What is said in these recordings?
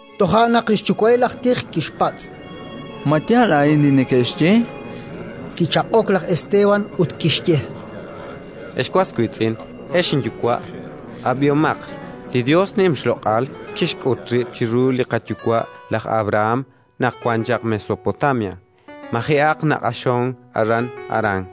Toja' naq li xyuwa'il aj tij kixpatz': “Ma yaal a'in li neke'xye?”, chan. Kichaq'ok laj Esteban, ut kixye: “Ex was wiitz'in, ex inyuwa', ab'ihomaq. Li Yos nim xloq'al kixk'ut rib' chiru li qayuwa' laj Abrahán naq wan chaq Mesopotamia, maji'aq naq'axonk aran Harán,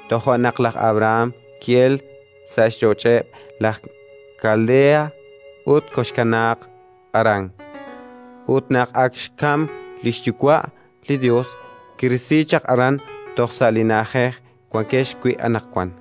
Toja' naq laj Abrahán ki'elk sa' xch'och'eb' laj Kaldeha ut koxkanaaq Harán. Ut naq ak xkamk li xyuwa', li Yos kirisi chaq aran toj sa' li na'ajej wankex wi' anaqwan;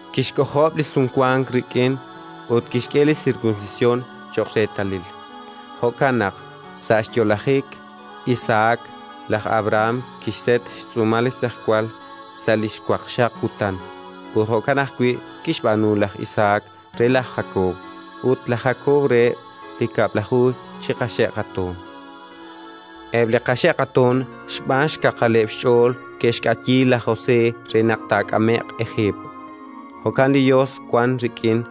Kixk'ojob' li Sumwank rik'in ut kixk'e li sirkunsisyon cho'q reetalil. Jo'kan naq, sa' xyo'lajik Isahak, laj Abrahán kixset xtz'uumal li xtz'ejwal sa' li xwaqxaq kutan; ut jo'kan ajwi' kixb'aanu laj Isahak re laj Jakob, ut laj Jakob reheb' li kab'laju chi qaxe' qatoon. “Eb' li qaxe' qatoon xb'aan xkaqaleb' xch'ool ke'xk'ayi laj José re naq taak'ame'q Ejiipt. Ut li Yos wank rik'in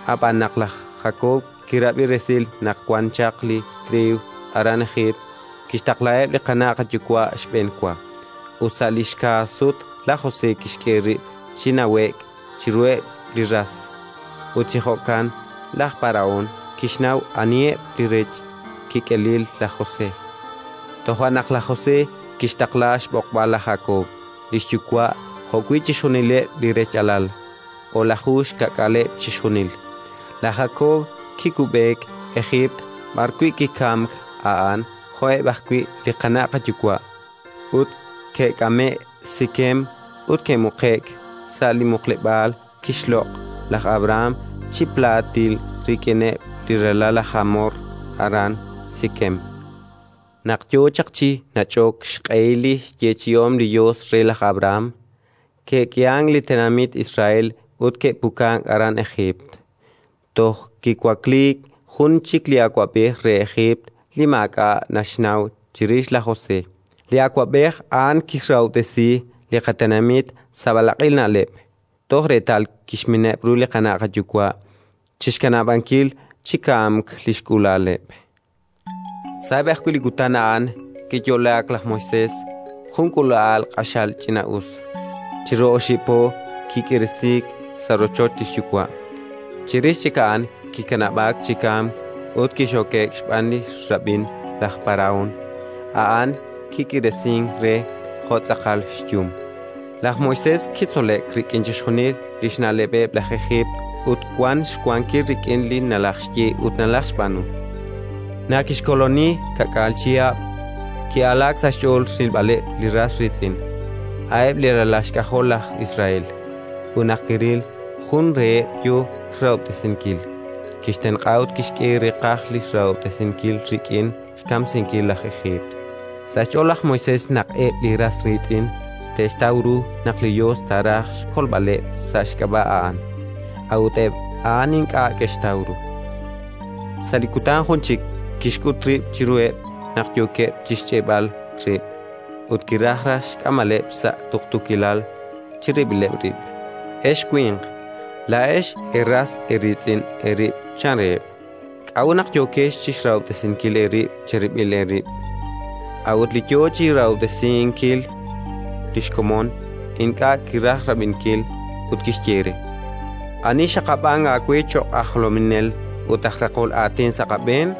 Ab'an, naq laj Jakob kirab'i resil naq wan chaq li triiw aran Ejiipt, kixtaqlaheb' li qana' qayuwa' xb'enwa; ut sa' li xka' sut laj José kixk'e rib' chi nawe'k chiruheb' li ras, ut chi jo'kan laj Parahón kixnaw aniheb' li rech kik'elil laj José. Toja' naq laj José kixtaqla xb'oqb'al laj Jakob, li xyuwa', jo'wi' chixjunileb' li rech'alal, o'laju xkaak'aaleb' chixjunil. Laj Jakob kikub'eek Ejiipt b'arwi' kikamk a'an jo'eb' ajwi' li qana' qayuwa'; ut ke'k'ame'k Sikem ut ke'muqe'k sa' li muqleb'aal kixloq' laj Abrahán chi plaatil rik'ineb' li ralal laj Jamor aran Sikem. “Naq yo chaq chi nach'ok xq'ehil li xyeechi'om li Yos re laj Abrahán, ke'k'ihank li tenamit Israel ut ke'pukank aran Ejiipt, toj kiwakliik jun chik li awab'ej re Ejiipt li maak'a' naxnaw chirix laj José. Li awab'ej a'an kixrahob'tesi li qatenamit sa' b'alaq'il na'leb', toj reetal kixmineb' ru li qana' qayuwa' chi xkanab'ankil chi kamk li xk'uula'aleb'. Sa'eb' ajwi' li kutan a'an kiyo'laak laj Moisés, jun k'uula'al q'axal ch'ina'us. Chiru oxib' po kik'iiresiik sa' rochoch li xyuwa'; chirix chik a'an kikanab'aak chi kamk ut kixoke'k xb'aan li xrab'in laj Parahón: a'an kik'iiresink re jo' tz'aqal xyum. Laj Moisés kitzole'k rik'in chixjunil li xna'leb'eb' laj Ejiipt ut wank xwankil rik'in li nalajxye ut nalajxb'aanu. “Naq kixkooloni ka'k'aal chihab', ki'alaak sa' xch'ool rilb'aleb' li ras riitz'in, a'eb' li ralal xk'ajol laj Israel. Ut naq kiril jun reheb' yo xrahob'tesinkil, kixtenq'a ut kixk'e reeqaj li xrahob'tesinkil rik'in xkamsinkil laj Ejiipt. Sa' xch'ool laj Moisés naq eb' li ras riitz'in te'xtaw ru naq li Yos taaraj xkolb'aleb' sa' xk'ab'a' a'an; a'ut eb' a'an ink'a' ke'xtaw ru. Sa' li kutan jun chik kixk'ut rib' chiruheb' naq yookeb' chi xch'e'b'al rib', ut kiraj raj xk'amb'aleb' sa' tuqtuukilal chirib'ileb' rib': «Ex winq, laa'ex eeras eeriitz'in eerib' -chan reheb'. K'a'ut naq yookex chi xrahob'tesinkil eerib' cherib'il eerib'?». A'ut li yo chi xrahob'tesinkil li xkomon ink'a' kiraj rab'inkil ut kixye re: «Ani xxaqab'ank aawe cho'q aj jolominel ut aj raqol aatin sa' qab'een?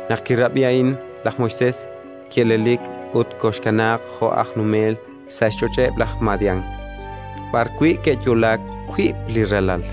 Naq kirab'i a'in laj Moisés, ki'elelik ut koxkanaaq jo' aj numel sa' xch'och'eb' laj Madián, b'arwi' ke'yo'laak wiib' li ralal.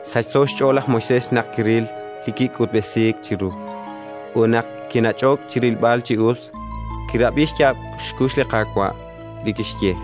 Sachso xch'ool laj Moisés naq kiril li kik'utb'esiik chiru; ut naq kinach'ok chi rilb'al chi us, kirab'i xyaab' xkux li Qaawa' li kixye: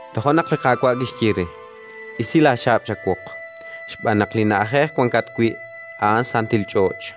Toja' naq li Qaawa' kixye re: «Isi laaxaab' chawoq, xb'aan naq li na'ajej wankat wi', a'an santil ch'och'.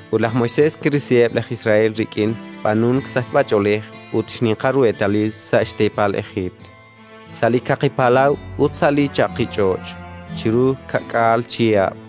Ut laj Moisés kirisiheb' laj Israel rik'in b'aanunk sachb'ach'oolej ut xninqal ru eetalil sa' xteepal Ejiipt, sa' li Kaqi Palaw ut sa' li chaqich'och', chiru ka'k'aal chihab'.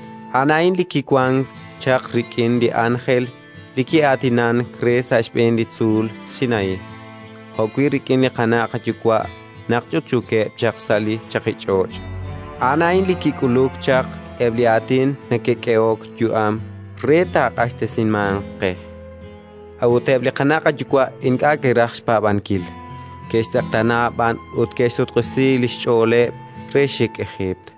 A'an a'in li kiwank chaq rik'in li ánjel li ki'aatinank re sa' xb'een li tzuul Sinaí, jo'wi' rik'in li qana' qayuwa' naq ch'utch'uukeb' chaq sa' li chaqich'och'; a'an a'in li kik'uluk chaq eb' li aatin neke'k'ehok yu'am re taaq'axtesimanq qe. “A'ut eb' li qana' qayuwa' ink'a' ke'raj xpaab'ankil, ke'xtz'eqtaana b'an ut ke'xsutq'isi li xch'ooleb' re xik Ejiipt,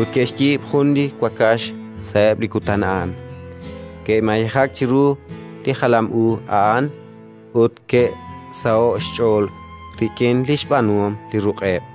Ut ke'xyiib' jun li wakax sa'eb' li kutan a'an, ke'mayejak chiru li jalam u a'an ut ke'saho'k xch'ool rik'in li xb'aanuhom li ruq'eb'.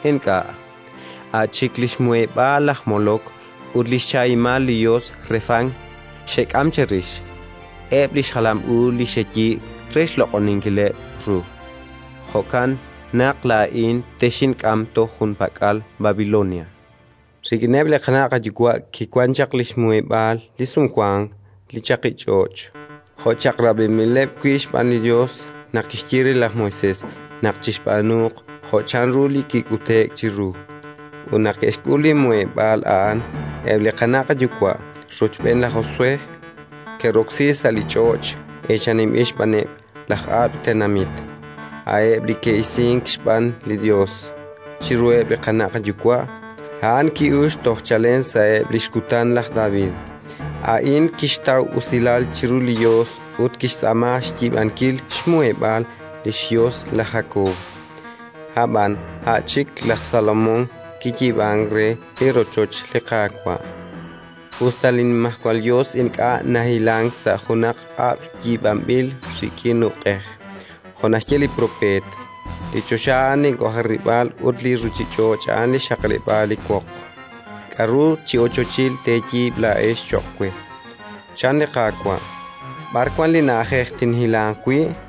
Ink'a', a' chik li xmuheb'aal laj Molok ut li xchahimal li yos Refán xek'am cherix, eb' li xjalam u li xeyiib' re xloq'oninkileb' ru. Jo'kan naq laa'in texink'am toj junpak'al Babilonia». “Rik'ineb' li qana' qayuwa' kiwank chaq li xmuheb'aal li Sumwank sa' li chaqich'och', jo' chaq'rab'inb'ileb' wi' xb'aan li Yos naq kixye re laj Moisés naq chixb'aanuuq jo' chanru kik'ute'k chiru. Ut naq ke'xk'ul li muheb'aal a'an, eb' li qana' qayuwa', rochb'een laj Josué, ke'roksi sa' li ch'och' eechaninb'il xb'aaneb' laj ab'l tenamit, a'eb' li ke'isiik xb'aan li Yos chiruheb' li qana' qayuwa'. A'an ki'uxk chalen toj sa'eb' li xkutan laj David. A'in kixtaw usilal chiru li Yos ut kixtz'aama xyiib'ankil xmuheb'aal li xYos laj Jakob. Ab'an a' chik laj Salomón kiyiib'ank re li rochoch li Qaawa', us ta li Nimajwal Yos ink'a' nahilank sa' junaq kab'l yiib'anb'il rik'in uq'ej, jo' naxye li propeet: «Li choxa a'an link'ojarib'aal ut li ruuchich'och' a'an li xxaqleb'aal li woq. K'aru chi ochochil teeyiib' laa'ex cho'q we? -chan li Qaawa'-. B'ar wank li na'ajej tinhilanq wi'?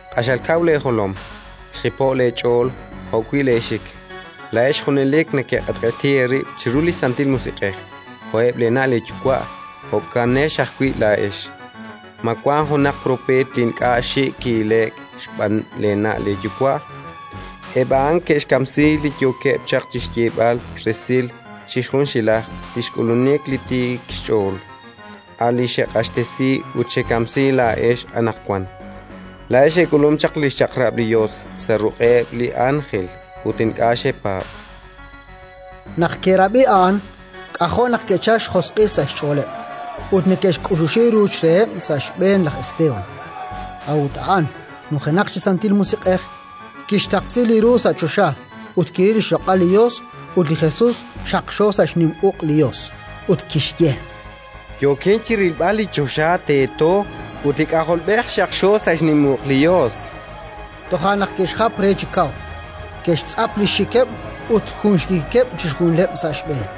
“Q'axal kaw leejolom, xjipo'k leech'ool jo'wi' leexik -chan laj Esteban-. Laa'ex junelik nekeq'etq'eti eerib' chiru li Santil Musiq'ej! Jo'eb' leena' leeyuwa', jo'kanex ajwi' laa'ex! Ma wank junaq propeet li ink'a' xik' ki'ile'k xb'aaneb' leena' leeyuwa'? Eb' a'an ke'xkamsi li yookeb' chaq chi xyeeb'al resil chi junxilaj li xk'ulunik li Tiik xch'ool, a' li xeq'axtesi ut xekamsi laa'ex anaqwan. Laa'ex eek'ulum chaq li xChaq'rab' li Yos sa' ruq'eb' li ánjel, ut ink'a' xepaab'”. Naq ke'rab'i a'an, k'ajo' naq ke'chalk xjosq'il sa' xch'ooleb', ut neke'xk'uxuxi ruuch reheb' sa' xb'een laj Esteban. A'ut a'an, nujenaq chi Santil Musiq'ej, kixtaqsi li ru sa' choxa ut kiril li xloq'al li Yos ut li Jesus xaqxo sa' xnim uq' li Yos, ut kixye: —Yookin chi rilb'al li choxa teeto ut li K'ajolb'ej xaqxo sa' xnim uq' li Yos. Toja' naq ke'xjap re chi kaw, ke'xtz'ap li xxikeb' ut jun xikikeb' chixjunileb' sa' xb'een;